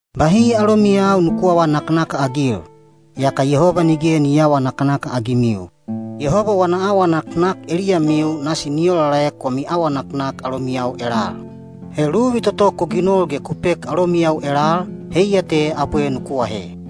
Bahi alomiyau nuku aawa naknakagil, yaka Yehoba nige ni aawa naknakagimiu. Yehoba wana awa naknak eliyamiu nasi ni olaolaek wami awa naknak alomiyau elal. He luvi toto ku ginol ge ku pek alomiyau elal, heiya te abwe nuku ahe.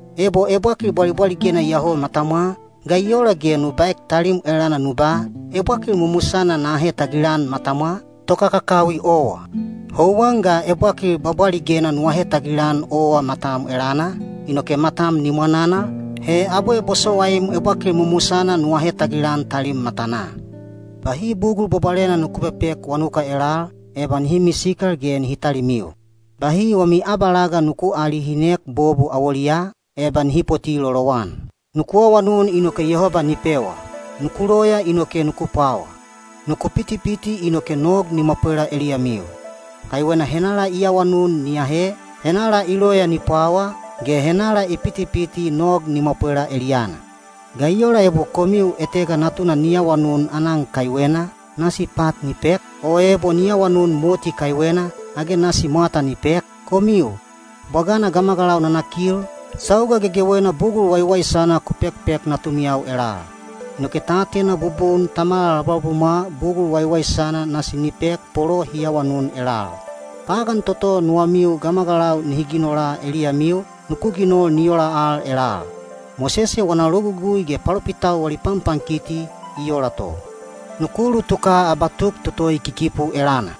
Ebo ebwakil bwabwaligena iyoho matamwa, ga i ola ge nu baek talim elana nu ba, “Ebwakil mumusana na ahe tagilan matamwa?” Tokakakawi owa! Houwan ga ebwakil bwabwaligena nu ahe tagilan owa matam elana, inoke matam ni mwananal, he abwe bosowaim ebwakil mumusana nu ahe tagilan talim matanaa. Bahi bugul bwabwalena nuku pepek wanuka elal, eba nihi misikal ge nihi talimiu. Bahi wami abalaga nuku aalihinek bobu awoliyaa, eba nihi poti lolowan. Nuku awanun inoke Yehoba ni pewa; nuku loya inoke nuku pwawa; nuku pitipiti inoke nog ni mwapwela eliyamiu. Kaiwena henala i awanun ni ahe, henala i loya ni pwawa, ge henala i pitipiti nog ni mwapwela eliyana. Ga i ola ebo komiu etega natuna ni awanun aanan kaiwena, nasi pat ni pek? O ebo ni awanun moti kaiwena, age nasi mwata ni pek? Komiu, bwagana gamagalau nanakil, sauga gegewena bugul waiwaisana ku pekpek natumiyau elal. Inoke ta atena bubun Tamamiu labulabumwa bugul waiwaisana nasi ni pek bolo hi awanun elal. Pagan toto nuwamiu gamagalau nihi ginola eliyamiu, nuku ginol ni ola al elal. Mosese wana Logugui ge palopitau wali panpankiti i ola to. Nuku ulutuka abatuk toto i kikipu elana.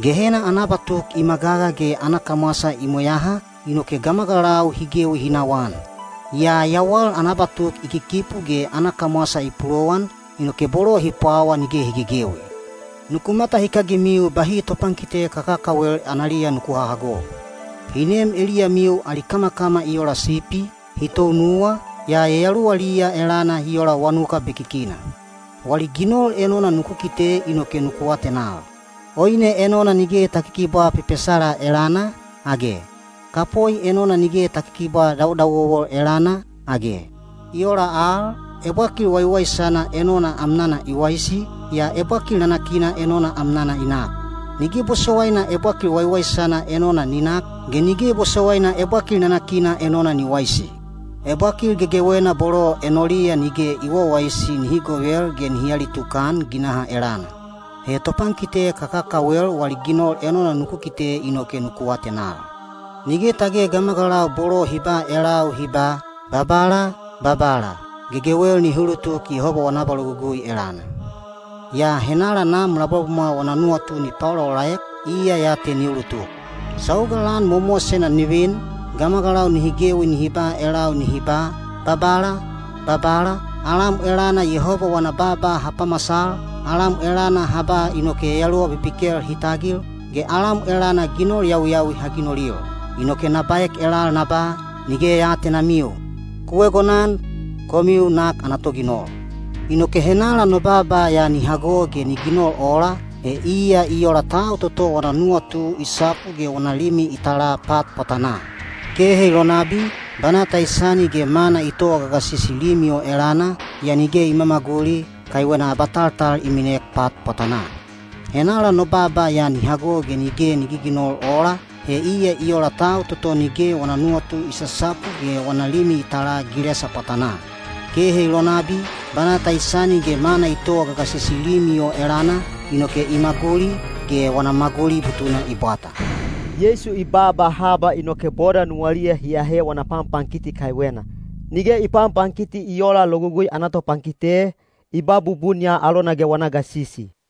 Gehena ana abatuk i magaga ge ana kamwasa i mweyaha, inoke gamagalau hi gewi hi nawaan. Yaa yawal ana abatuk i kikipu ge ana kamwasa i pulowan, inoke bolo hi pwawa nige hi gegewi. Nuku matahikagimiu bahi topankite kakakawel analiya nuku hahago. Hi nem eliyamiu ali kamakama i ola sipi, hi tounuwa, yaa yayaluwaliya elana hi ola wanuka sosokal. Wali ginol enona nuku kite inoke nuku atenal. Oine enona nige ta kikibwaa pepesala elana, age? Kapoi enona nige ta kikibwaa dawodawowo elana, age? I ola al, ebwakil waiwaisana enona amnana i waisi, yaa ebwakil nanakina enona amnana i nak. Nige bosowaina ebwakil waiwaisana enona ni nak, ge nige bosowaina ebwakil nanakina enona ni waisi. Ebwakil gegewena bolo enoliya nige i wawaisi nihi govel ge nihi alitukan ginaha elana. He topankite kakakawel wali ginol enona nuku kite inoke nuku atenal. Nige tage gamagalau bolo hi ba elau hi ba, “Babala, babala” gegewel nihi ulutuk Yehoba wana abalogugui elana. Yaa henala Nam labulabumwa wana nuwatu ni paolaolaek, iya ya te ni ulutuk. Sauga lan mowamowasena ni vin, gamagalau nihi gewi nihi ba elau nihi ba, “Babala, babala, alam elana Yehoba wana baaba ha pamasal, alam elana ha ba inoke yayaluwa bibikel hi tagil, ge alam elana ginol yawiyawi ha ginolil.” Inoke na baek elal na ba, “Nige ya aatenamiu. Ku egonan, komiu nak ana toginol.” Inoke henala no baaba ya ni hago ge ni ginol ola, he iya i ola tau toto wana nuwatu i sapu ge wana limi i tala pat pwatanaa. Kehe i lonabi, banata i sani ge mana i towa gagasisi limi o elana, yaa nige i mamaguli, kaiwena abataltal i minek pat pwatanaa. Henala no baaba ya ni hago ge nige ni giginol ola, he iya i ola tau toto nige wana nuwatu i sasapu ge wana limi i tala gilesa pwatanaa. Kehe i lonabi, banata i sani ge mana i towa gagasisi limi o elana, inoke i maguli, ge wana maguli butuna i bwata. Sauga Yeisu baaba ya i baunan haba, inoke boda nuwaliya hi ahe wana panpankiti kaiwena. Nige i panpankiti i oola Logugui ana topankite, i ba bubun ya alona ge wana gasisi.